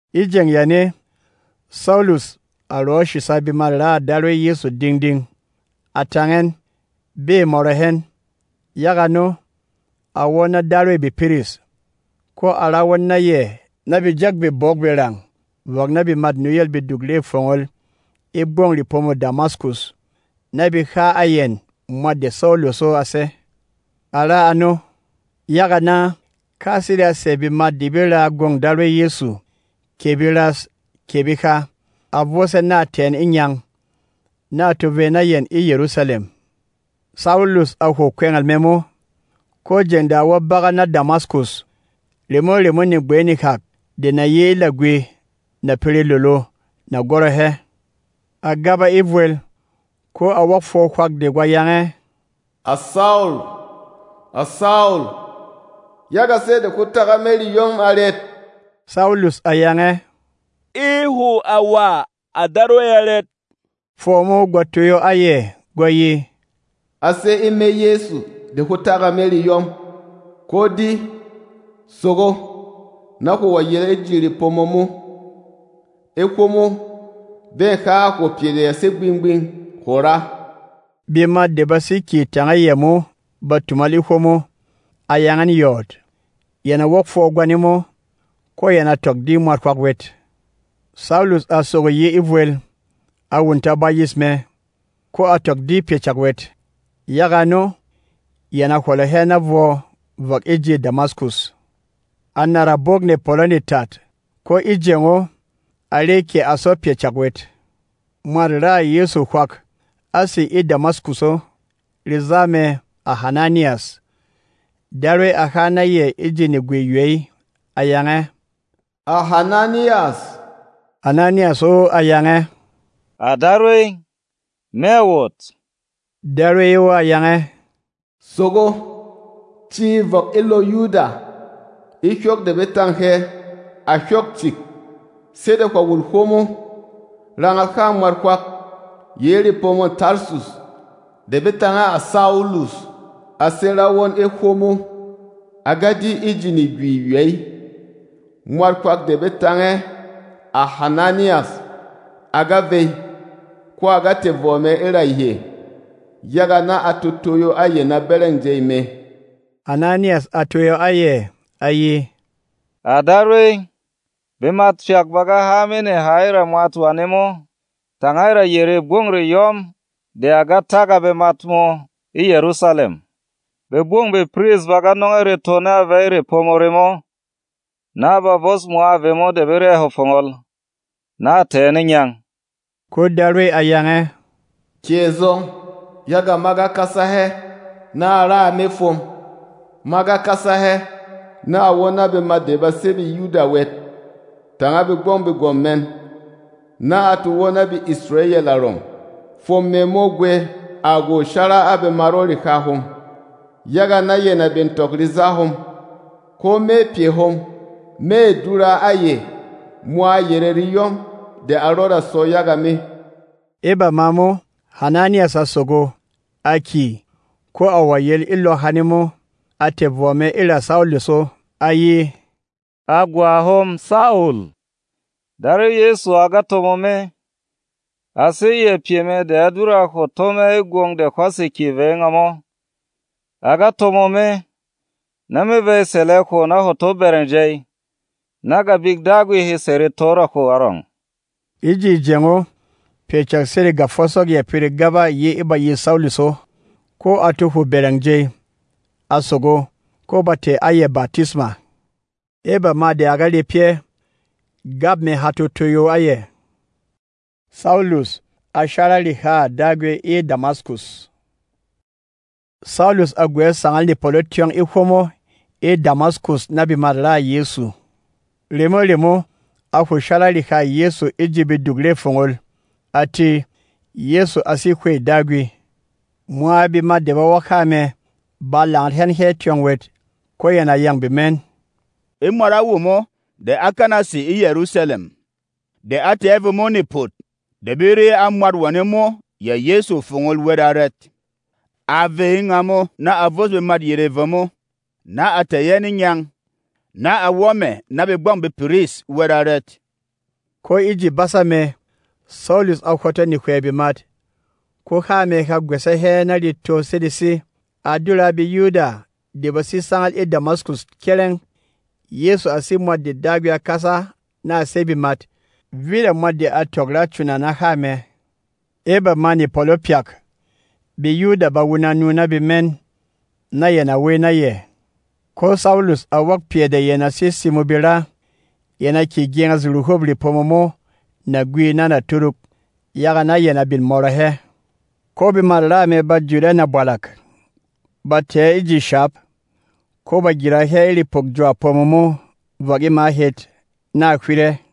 E jeng yane, Saulus a rɔ̌ shìsa bemat-raà Darwey Yɛsu ding-ding, a tang ɛn, bê mɔrɔ hɛn. Yaga ano, a wɔ́ na darwêy bepiris, ko a ra won na yɛ na be jɛk bebok-berang vɔk na bemât nuyêl beduk re fongol e gbɔng repomô Damaskus, na be ha a yɛn mwat de Saulus o a sé. A ra ano, yaga na, ka sede a sɛ̀ bemat de be raa gwông Darwey Yɛsu, kɛ beras kɛ beha, a vos ɛn na a tɛ̀ ɛn e ngyang, na a to vey na yɛn e Yɛrusalɛm. Saulus a hwo kwɛngɛl mɛ mo, ko jeng de a wɔ́ bagat na Damaskus, remo-remo negbey nehak de na yi e lagwi na pere lolo, na gwɔrɔ hɛ. A gaba e vwel, ko a wok fwɔ hwak de gwa yang ɛ, “À Saul! À Saul! Yaga sɛ́ de hwó tak a me reyɔm arɛt?” Saulus a yang ɛ, “E hwo à wà, à Darwey arɛt?” Fwɔ mo gwa toyo a yɛ, gwa ye, “A sé e me Yɛsu de hwó tak a me reyɔm. Ko di, sogo, na hwo wɔ̀ yel e ji repomo mo. E hwomo, bê ha a hwo pyɛ de ya sé gbing-gbing hwo ra.” Bemat de ba sé kyè tanga yɛ mo ba tumal e hwomo, a yang ɛn yɔɔt. Yɛn a wok fwɔ gwane mo, ko yɛn a tɔk di mwat hwak wɛt. Saulus a sogo yi e vwel, a wunta bayis mɛ, ko a tɔk di pyɛ cak wɛt. Yaga ano, yɛn a hwɔlɔ hɛ na vwɔ vɔk e ji Damaskus. A nàra bwók nepɔlɔ netat; ko e jeng o, a re kɛ a sɔ pyɛ cak wɛt. Mwat-raà Yɛsu hwak á sè e Damaskus o, reza mɛ, à Hananiyas. Darwey a ha na yɛ e ji negwi-ywey, a yang ɛ, “À Hananiyas!” Hananiyas o a yang ɛ, “À Darwey, me à wot.” Darwey o a yang ɛ, “Sogo, ci vɔk e lɔ Yuda, e hyok de be tâng hɛ, à Hyok Cik. Sede hwà wul hwomo, rangal hâ mwat hwak yi e repomô Tarsus de be tang ɛ, à Saulus. A sé ra won e hwomo. A ga di e ji negwi-ywey mwat hwak de be tang ɛ, à Hananiyas a ga vey, ko a ga tɛ̀ vɔ mɛ e ra yɛ, yaga na a to toyo a yɛ na bɛrɛng jey mɛ.” Hananiyas a toyo a yɛ, a ye, “À Darwey, bemat pyak ba ga há a me neha e ra mwat wane mo tanga e ra yerê gbɔng reyɔm de a ga tak a bemat mō e Yɛrusalɛm. Begbɔng bepiris ba ga nɔng ɛ reto na a vey e repomo remo, na a ba vos mwa vemo de be re a hwo fongol, na a tɛ̀ ɛn e ngyang.” Ko Darwey a yang ɛ, “Kyè zɔng, yaga ma ga kasa hɛ na a ra a me fwom. Ma ga kasa hɛ na a wɔ́ na bemat de ba sé BeYuda wɛt tanga begbɔng begwɔ̀m mɛn, na a to wɔ́ na BeIsrayɛl arɔng. Fwom mɛ mo gwɛ à gwô shara a bemat o reha hom, yaga na yɛn a bin tɔk reza hom. Ko me pyɛ hom mê dura a yɛ mwa yerê reyɔm de a rɔda sɔ yaga me.” E bama mo, Hananiyas a sogo, a kyè, ko a wɔ̀ yel e lɔ hane mo. A tɛ̀ vɔ mɛ e ra Saulus o, a ye, “À gwa hom Saul, Darwey Yɛsu a ga tomo me. A sé yɛ pyɛ mɛ de á dura a hwo tó mɛ e gwong de hwá sè kyè vey e ngamo. A ga tomo me, na me vey sɛlɛ hwo na hwo to bɛrɛng jey, na Gabik Dagwi he sɛ̀ reto e ra hwo arɔng.” E ji jeng o, pyɛ cak sede gafosok ya pere gaba yi e bayîs Saulus o, ko a to hwo bɛrɛng jey. A sogo, ko ba tɛ̀ a yɛ batisma. E bama de a ga re pyɛ́, gap mɛ ha to toyo a yɛ. Saulus a shara rehâ Dagwi e Damaskus Saulus a gwɛ̌ sangal nepɔlɔ tyɔng e hwomo e Damaskus na bemat-raà Yɛsu. Remo-remo, a hwo shara rehâ Yɛsu e ji beduk re fongol, a tē, Yɛsu a sé Hwey Dagwi. Mwa bemat de ba wok há mɛ ba langat hɛn hɛ́ tyɔng wɛt, ko yɛn a yâng bemɛn, “E mwat a womo de á kana sè e Yɛrusalɛm, de a tɛ̀ a vemo nepòt de be re a mwat wane mo, yɛ Yɛsu, fongol wɛt arɛt? A vey e ngamo na a vos bemat yerê vemo, na a tɛ̀ ɛn e ngyang, na a wɔ́ mɛ̀ na begbɔng bepiris wɛt arɛt?” Ko e ji basa mɛ Saulus a hwɔtɔ nehywɛ bemat, ko há mɛ ha gwɛsɛ hɛ na reto sedesi. A dura a BeYuda de ba sé sangal e Damaskus kyɛrɛng, Yɛsu a sé Mwat de Dagwi a kasa na a sey bemat. Vit a mwat de a tɔk ra cuna na há mɛ. E bamâ nepɔlɔ pyak, BeYuda ba wuna nu na bemɛn, na yɛn a wey na yɛ. Ko Saulus a wok pyɛ de yɛn a sé simo be ra. Yɛn a kyě gyenges ruhûp repomo mo nagwi na naturuk, yaga na yɛn a bin mɔrɔ hɛ. Ko bemât raa mɛ ba jut ɛ nabwalak, ba tɛ̀ ɛ e ji shap, ko ba gyira hɛ e repɔk jwa-pomo mo vɔk e ma het, na a hywit ɛ.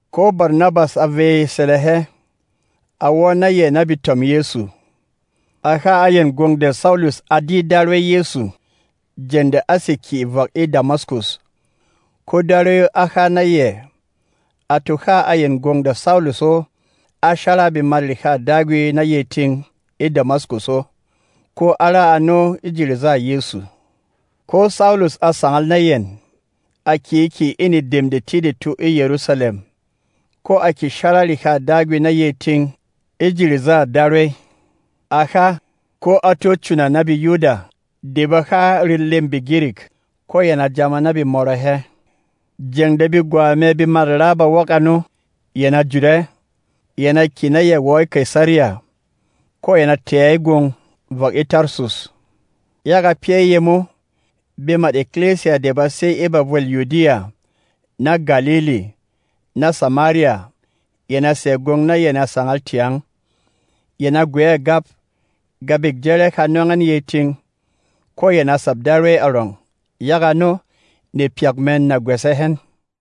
Ko Barnabas a vey sɛlɛ hɛ, a wɔ́ na yɛ na betom Yɛsu. A ha a yɛn gwong de Saulus á di Darwey Yɛsu jeng de á sè kyè vɔk e Damaskus, ko Darwey o á ha na yɛ. A to ha a yɛn gwong de Saulus o á shara a bemat rehâ Dagwi na yey ting e Damaskus o, ko á ra ano e ji rezâ Yɛsu. Ko Saulus a sangal na yɛn, a kyě kyè e nedem detidetu e Yɛrusalɛm, ko a kyě shara rehâ Dagwi na yey ting e ji rezâ Darwey. A ha, ko a tó cuna na BeYuda de ba ha relêm BeGirik. Ko yɛn a jāma na be mɔrɔ hɛ. Jeng de begwa mɛ bemat-raa ba wok ano, yɛn a jut ɛ, yɛn a kyè na yɛ wɔ e Kaisariya, ko yɛn a tɛ̀ ɛ e gwong vɔk e Tarsus. Yaga pyɛ́ yemo, bemât ekilisiya de ba sé e bavwêl Yudiya, na Galili, na Samariya yɛn a sɛ̀ gwong na yɛn a sangal tyang. Yɛn a gwɛ̌ gap; Gabik Jɛrɛ ha nɔng ɛn yey ting, ko yɛn a sap Darwey arɔng. Yaga ano, nepyak mɛn na gwɛsɛ hɛn.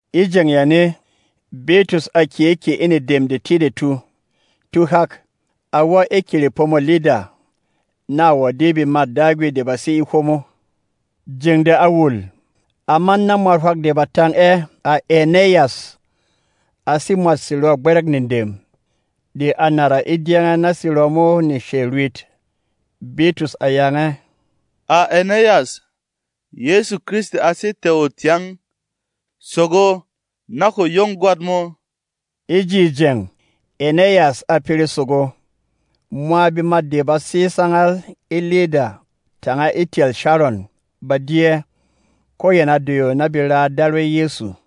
E jeng yane, Bitrus a kyě kyè e nedem detidetu. Tuhak, a wɔ́ e kerepomô Lida, na a wɔ̀ di bemât Dagwi de ba sé e hwomo. Jeng de a wul, a man na mwat hwak de ba tang ɛ, à Ɛnɛyas. A sé mwât serɔ̂ gbɛrɛ̂k nedem, de a nàra e dyɛngɛ na serɔ mo neshey rwit. Bitrus a yang ɛ, “À Ɛnɛyas, Yɛsu Kristi a sé tɛ̀ o tyang. Sogo, na hwo yong gwat mō.” E ji jeng, Ɛnɛyas a pere sogo. Mwa bemat de ba sé sangal e Lida tanga e tyɛl Sharon ba di ɛ, ko yɛn a doyo na be raa Darwey Yɛsu.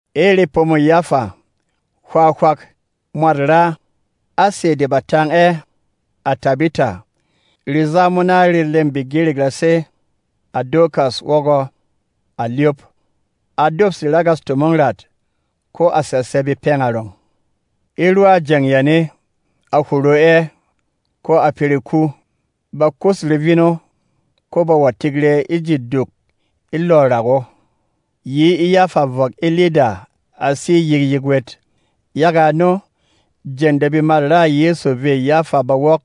E repomô Yafa, hwā hwak, mwat-raa, á sɛ̀ de ba tang ɛ, à Tabita. (Reza mo na relêm BeGirik ra sé, à Dorkas wɔgɔ, à Lyop.) A dopse ragas tomong rat, ko a sɛlsɛ bepɛng arɔng. E rwa jeng yane, a hwo ro ɛ, ko a pere ku. Ba kus revin o, ko ba wɔ̀ tik rɛ e ji duk e lɔ̂ rak o. Yi e Yafa vɔk e Lida a sé yikyik wɛt. Yaga ano, jeng de bemat-raà Yɛsu vê Yafa ba wok,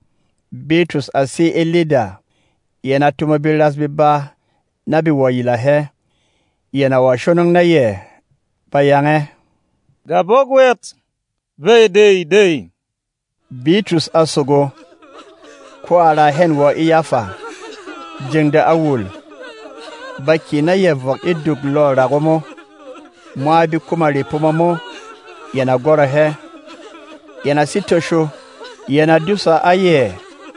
Bitrus a sé e Lida, yɛn a tomo beras beba na be wɔ̀ yila hɛ. Yɛn a wɔ̀ shonong na yɛ, ba yang ɛ, “Gabɔk wɛt, vey dey-dey!” Bitrus a sogo, ko a raa hɛn wɔ e Yafa. Jeng de a wul, ba kyè na yɛ vɔk e duk lɔ̂ rak o mo. Mwa bekuma repomo mo yɛn a gwɔrɔ hɛ, yɛn a sé tosho, yɛn a dúsa a yɛ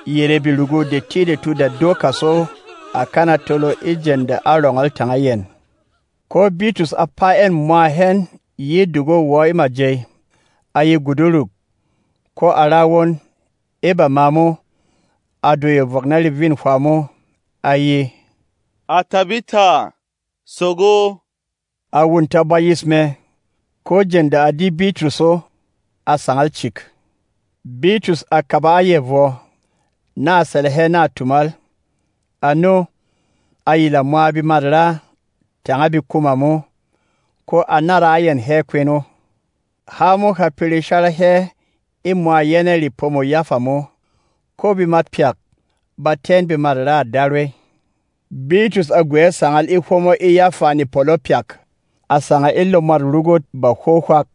yerê berugu detidetu de Dorkas o á kana tolo e jeng de á rɔngɔl tanga yɛn. Ko Bitrus a paa ɛn mwa hɛn yi e duk o wɔ e majey, a ye guduruk, ko a ra won. E bama mo, a doyo vɔk na revîn hwā mo, a ye, “À Tabita, sogo!” A wunta bayis mɛ, ko jeng de a di Bitrus o, a sangal cik. Bitrus a kaba a yɛ vwɔ, na a sɛlɛ hɛ na a tumal. Ano, a yila mwa bemat-raa tanga bekuma mo, ko a nára a yɛn hɛ kwen o. Há mo ha pere shara hɛ e mwa yɛnɛ̂ repomô Yafa mo, ko bemat pyak ba tɛ́ ɛn bemat-raà Darwey. Bitrus a gwɛ̌ sangal e hwomo e Yafa nepɔlɔ pyak. A sangal e lɔ mwât rugût bahwo hwak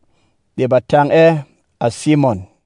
de ba tang ɛ, à Simɔn.